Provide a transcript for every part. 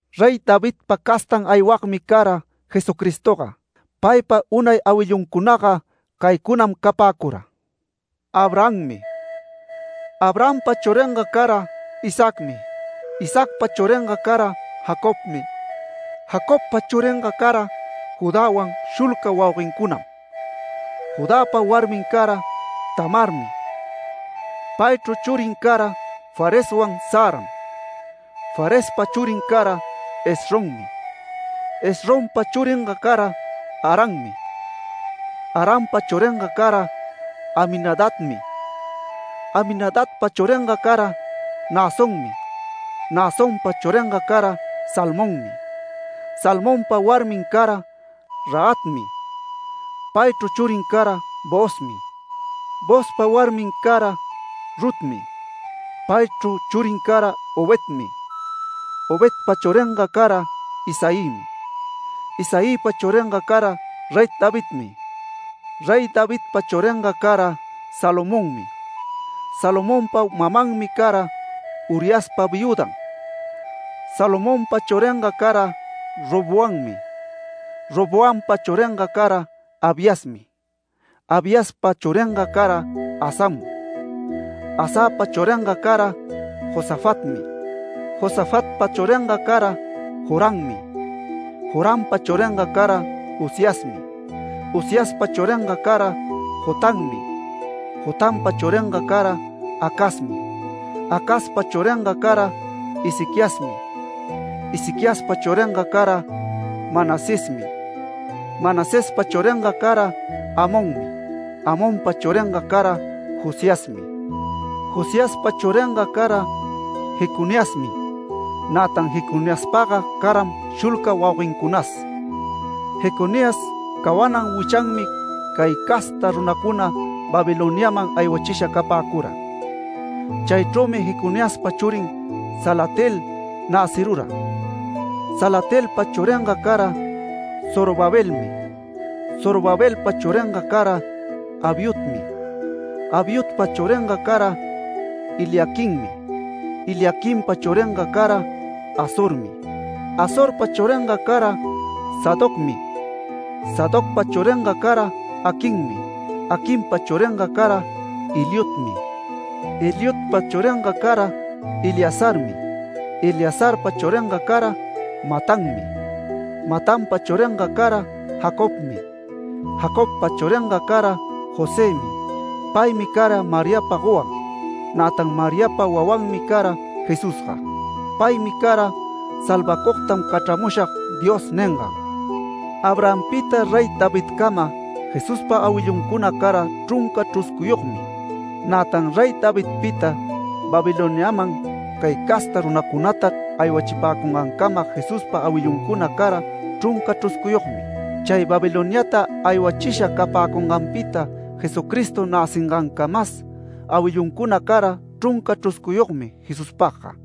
Rey Davidpa castan aywagmi cara Jesucristoga. Paypa unay awilluncunaga caycunam capäcura: Abrahammi. Abrahampa churinga cara Isaacmi. Isaacpa churinga cara Jacobmi. Jacobpa churinga cara Judäwan shulca wauguencunam. Judäpa warmin cara Tamarmi. Paychru churin cara Fareswan Zaram. Farespa churin cara Esrommi. Esrompa churinga cara Arammi. Arampa churinga cara Aminadabmi. Aminadabpa churinga cara Naasonmi. Naasonpa churinga cara Salmonmi. Salmonpa warmin cara Rahabmi. Paychru churin cara Boozmi. Boozpa warmin cara Rutmi. Paychru churin cara Obedmi. Obedpa churinga cara Isaïmi. Isaïpa churinga cara Rey Davidmi. Rey Davidpa churinga cara Salomonmi. Salomonpa mamanmi cara Uriaspa viüdan. Salomonpa churinga cara Roboammi. Roboampa churinga cara Abiasmi. Abiaspa churinga cara Asam. Asapa churinga cara Josafatmi. Josafatpa churinga cara Jorammi. Jorampa churinga cara Uziasmi. Uziaspa churinga cara Jotammi. Jotampa churinga cara Acazmi. Acazpa churinga cara Ezequiasmi. Ezequiaspa churinga cara Manasesmi. Manasespa churinga cara Amonmi. Amonpa churinga cara Josiasmi. Josiaspa churinga cara Jeconiasmi, nätan Jeconiaspaga caram shulca wauguencunas. Jeconías cawanan wichanmi cay casta runacuna Babiloniaman aywachisha capäcura. Chaychrümi Jeconiaspa churin Salatiel näcirura. Salatielpa churinga cara Zorobabelmi. Zorobabelpa churinga cara Abiudmi. Abiudpa churinga cara Eliaquimmi. Eliaquimpa churinga cara Azormi. Azorpa churinga cara Sadocmi. Sadocpa churinga cara Aquimmi. Aquimpa churinga cara Eliudmi. Eliudpa churinga cara Eleazarmi. Eleazarpa churinga cara Matanmi. Matanpa churinga cara Jacobmi. Jacobpa churinga cara Josëmi. Paymi cara Mariapa gowan. Nätan Mariapa wawanmi cara Jesusga. Paymi cara ‘Salvacugtam cachramushag’ Diosga ningan. Abrahampita Rey Davidcama Jesuspa awilluncuna cara chrunca chruscuyogmi. Nätan Rey Davidpita Babiloniaman cay casta runacunata aywachipäcungancama Jesuspa awilluncuna cara chrunca chruscuyogmi. Chay Babiloniata aywachisha capäcunganpita Jesucristo näcingancamas awilluncuna cara chrunca chruscuyogmi Jesuspagga.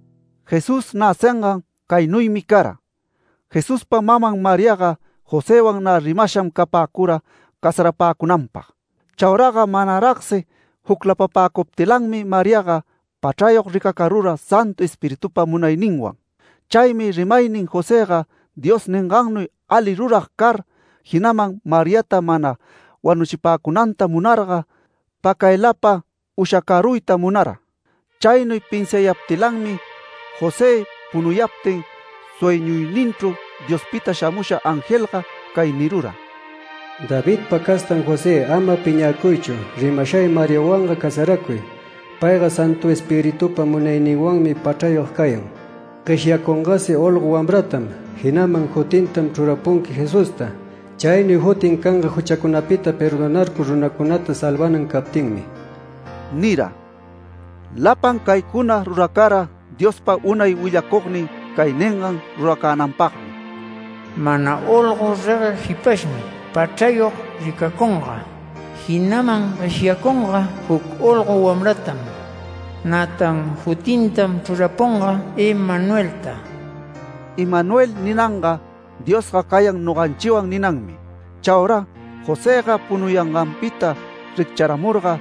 Jesús näcingan caynuymi cara: Jesuspa maman Mariaga Josëwan nä rimasham capäcura casarapäcunanpag. Chauraga manaragsi juclapapäcuptilanmi Mariaga pachrayog ricacarura Santu Espiritupa munayninwan. Chaymi rimaynin Josëga Dios ningannuy ali rurag car, jinaman Mariata mana wanuchipäcunanta munarga pacaylapa ushacaruyta munara. Chaynuy pinsiayaptilanmi, José punuyaptin sueñuyninchru Diospita shamusha angelga cay nirura: “Davidpa castan José, ama piñäcuychu rimashay Mariawanga casaracuy. Payga Santu Espiritupa munayninwanmi pachrayog cayan. Gueshyacungasi olgo wamratam. Jinaman jutintam chrurapunqui Jesusta. Chaynuy jutin canga juchacunapita perdonarcur runancunata salvanan captinmi” nira. Lapan caycuna ruracara Diospa unay willacugnin cay ningan ruracänanpagmi: “Mana olgo regueg jipashmi pachrayog ricacunga, jinaman gueshyacunga juc olgo wamratam. Nätan jutintam chrurapunga Emanuelta”. (‘Emanuel’ ninanga ‘Diosga cayan noganchiwan’ ninanmi.) Chaura Josëga punuyanganpita riccharamurga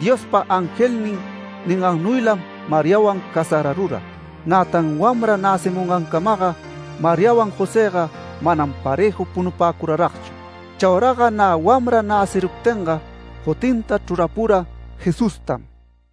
Diospa angelnin ningannuylam Mariawan casararura. Nätan wamra näcimungancamaga Mariawan Josëga manam parëju punupäcuraragchu. Chauraga nä wamra näciruptinga jutinta chrurapura Jesustam.